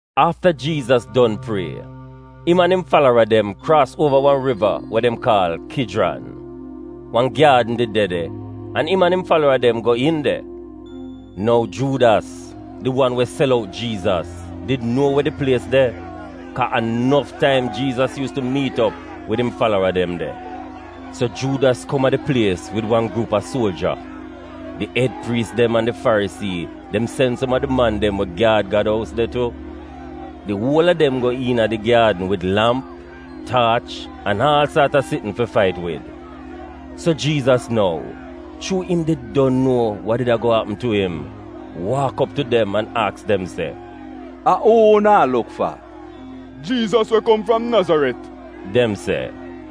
Afta Jiizas don prie, im an im falara dem kraas uova wan riva we dem kaal Kijran. Wan gyaadn did de de, an im an im falara dem go iin de. (Nou Juudas, di wan we sel out Jiizas, did nuo we di plies de, kaa a nof taim Jiizas yuus tu miit op wid im falara dem de.) So Juudas kom a di plies wid wan gruup a suoja. Di ed priis dem an di Farisii dem sen som a di man dem we gyaad Gad ous de tu. Di uol a dem go iina di gyaadn wid lamp, taach an aal saat a sitn fi fait wid. So Jiizas nou, chuu im did don nuo wa did ago apm tu im, waak op tu dem an aks dem se, “A uu unu a luk fa?” “Jiizas we kom fram Nazaret,” dem se.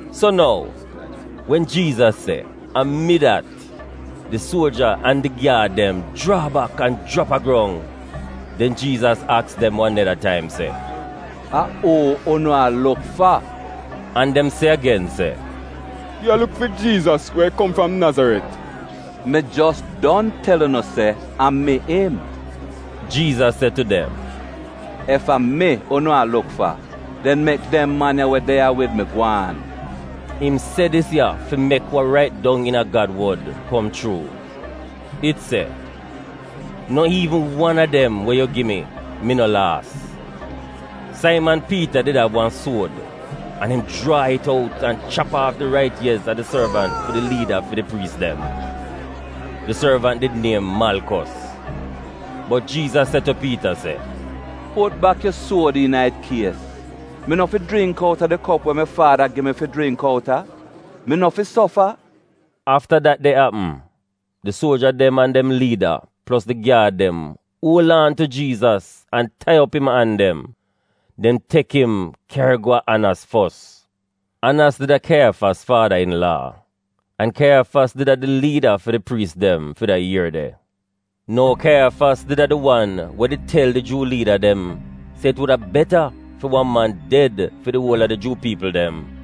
So nou, wen Jiizas se, “A mi dat,” di suoja an di gyaad dem jraa bak an jrap a grong. Den Jiizas aks dem wan neda taim se, “A uu unu a luk fa?” An dem se agen se, “Wi a luk fi Jiizas we kom fram Nazaret.” “Mi jos don tel unu se a mi im,” Jiizas se tu dem. “Ef a mi unu a luk fa, den mek dem man ya we de ya wid mi gwaan.” Im se dis ya fi mek wa rait dong iina Gad wod kom chuu. It se, “No iivn wan a dem we yu gi mi, mi no laas.” Saiman Piita did av wan suod, an im jraa it out an chap aaf di rait iez a di sorvant fi di liida fi di priis dem. (Di sorvant did niem Malkos.) Bot Jiizas se tu Piita se, “Put bak yu suod iina it kies! Mi no fi jringk outa di kop we mi Faada gi mi fi jringk outa? Mi no fi sofa?” Afta dat de apm, di suoja dem an dem liida plos di gyaad dem uol aan tu Jiizas an tai op im an dem. Dem tek im kyari go a Anos fos. Anos did a Kaiyafas faada-in-laa, Kaiyafas we did a di liida fi di priis dem fi da ier de. (Nou Kaiyafas did a di wan we did tel di Juu liida dem se it wuda beta fi wan man ded fi di uol a di Juu piipl dem.)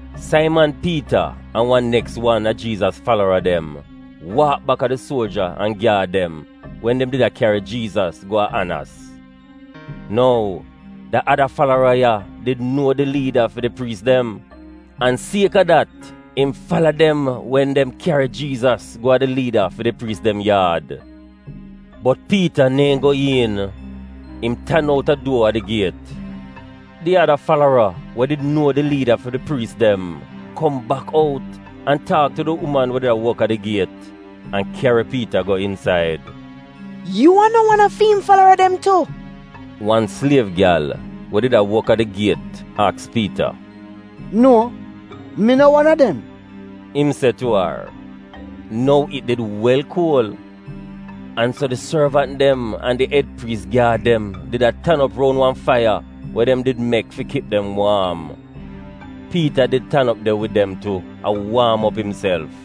Saiman Piita an wan neks wan a Jiizas falara dem waak bak a di suoja an gyaad dem wen dem did a kyari Jiizas go a Anos. (Nou, da ada falara ya did nuo di liida fi di priis dem, an sieka dat, im fala dem wen dem kyari Jiizas go a di liida fi di priis dem yaad.) Bot Piita neehn go iin. Im tan outa duo a di giet. Di ada falara we did nuo di liida fi di priis dem kom bak out an taak tu di uman we did a wok a di giet an kyari Piita go insaid. “Yu a no wan a fi im falara dem tu?” wan sliev gyal we did a wok a di giet aks Piita. “Nuo, mi no wan a dem,” im se tu ar. (Nou it did wel kuol, an so di sorvant dem an di ed priis gyaad dem did a tan op roun wan faiya we dem did mek fi kip dem waam. Piita did tan op de wid dem tu, a waam op imself.)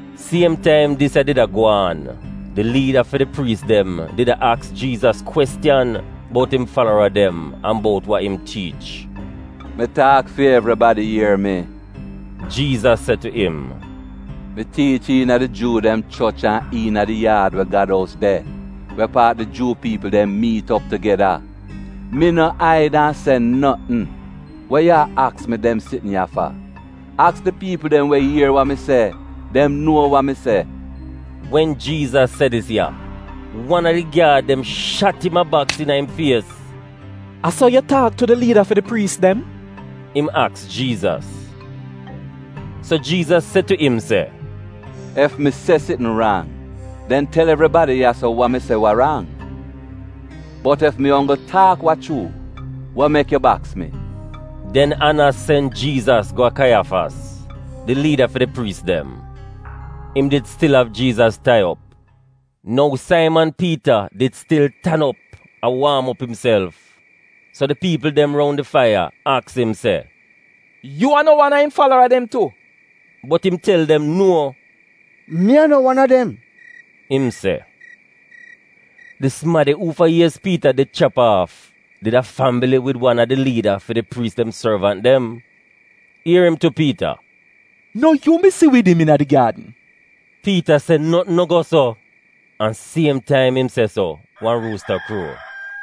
Siem taim dis ya did a gwaan, di liida fi di priis dem did a aks Jiizas kwestiyan bout im falara dem an bout wa im tiich. “Mi taak fi evribadi ier mi,” Jiizas se tu im. “Mi tiich iina di Juu dem choch an iina di yaad we Gad ous de — we paat di Juu piipl dem miit op tugeda. Mi no aid an se notn. Wa yu a aks mi dem sitn ya fa? Aks di piipl dem we ier wa mi se. Dem nuo wa mi se.” Wen Jiizas se dis ya, wan a di gyaad dem shat im a baks iina im fies. “A so yu taak tu di liida fi di priis dem?” im aks Jiizas. So Jiizas se tu im se, “Ef mi se sitn rang, den tel evribadi ya-so wa mi se we rang. Bot ef mi onggl taak wa chuu, wa mek yu baks mi?” Den Anos sen Jiizas go a Kaiyafas, di liida fi di priis dem. Im did stil av Jiizas tai op. Nou Saiman Piita did stil tan op a waam op imself, so di piipl dem roun di faiya aks im se, “Yu a no wan a im falara dem tu?” Bot im tel dem nuo. “Mi a no wan a dem,” im se. Di sumadi uufa iez Piita did chap aaf, did a fambili wid wan a di liida fi di priis dem sorvant dem. Ier im tu Piita, “No yu mi si wid im iina di gyaadn?” Piita se notn no go so, an siem taim im se so wan ruusta kruo.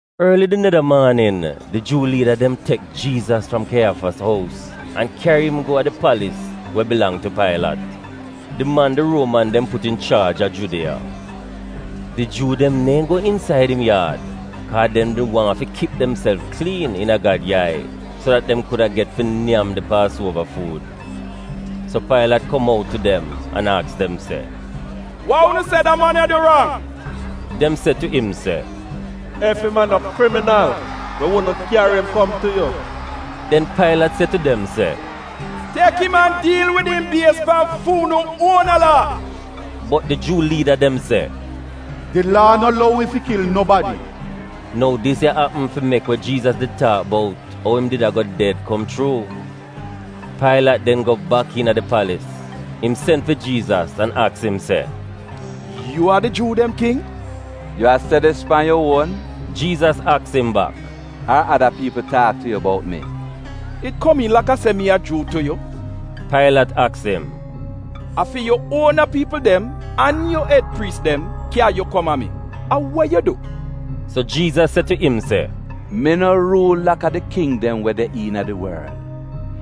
Orli di neda maanin, di Juu liida dem tek Jiizas fram Kaiyafas ous an kyari im go a di palis we bilang tu Pailat, di man di Ruoman dem put inchaaj a Judiya. Di Juu dem neehn go insaida im yaad, kaa dem did wan fi kip demself kliin iina Gad yai so dat dem kuda get fi nyam di Paasuova fuud. So Pailat kom out tu dem an aks dem se “Wa unu se da man ya du rang?” Dem se tu im se, “Ef im a no kriminal, wi wudn kyari im kom tu yu.” Den Pailat se tu dem se, “Tek im an diil wid im bies pan fi unu uona laa.” Bot di Juu liida dem se, “Di laa no lou wi fi kil nobadi.” (Nou dis ya apm fi mek we Jiizas did taak bout ou im did ago ded kom chuu.) Pailat den go bak iina di palis, im sen fi Jiizas an aks im se, “Yu a di Juu dem king?” “Yu a se dis ya pan yu uon,” Jiizas aks im bak, “ar ada piipl taak tu yu bout mi?” “It komiin laka se mi a Juu tu yu?” Pailat aks im. “A fi yu uona piipl dem an yu ed priis dem kya yu kom a mi. A we yu du?” So Jiizas se tu im se, “Mi no ruul laka di king dem we de iina di worl.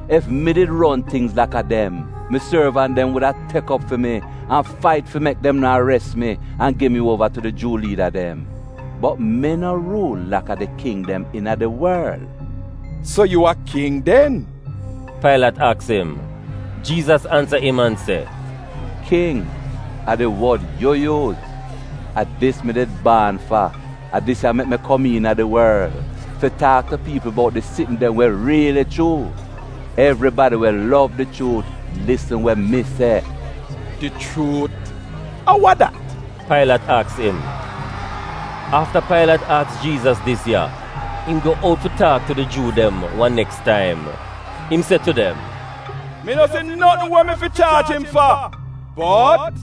Ef mi did ron tingz laka dem, mi sorvant dem wuda tek op fi mi an fait fi mek dem no ares mi an gi mi uova tu di Juu liida dem. Bot mi no ruul laka di king dem iina di worl.” “So yu a king, den?!”, Pailat aks im. Jiizas ansa im an se, “‘King,’ a di wod yu yuuz. A dis mi did baan fa; a dis ya mek mi kom iina di worl: fi taak tu piipl bout di sitn dem we riili chuu. Evribadi we lov di chuut lisn we mi se.” “Di chuut, a wa dat?” Pailat aks im. Afta Pailat aks Jiizas dis ya, im go out fi taak tu di Juu dem wan neks taim. Im se tu dem, “Mi no si notn we mi fi chaaj im fa. Bot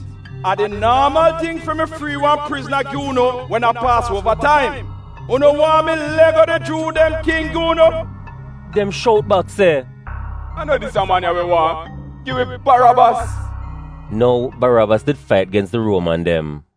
a di naamal ting fi mi frii wan prizna gi unu wen a Paasuova taim. Unu waahn mi lego di Juu dem King gi unu”? Dem shout bak se, “A no dis ya man ya wi waahn. Gi wi Barabas. (Nou, Barabas did fait gens di Ruoman dem.)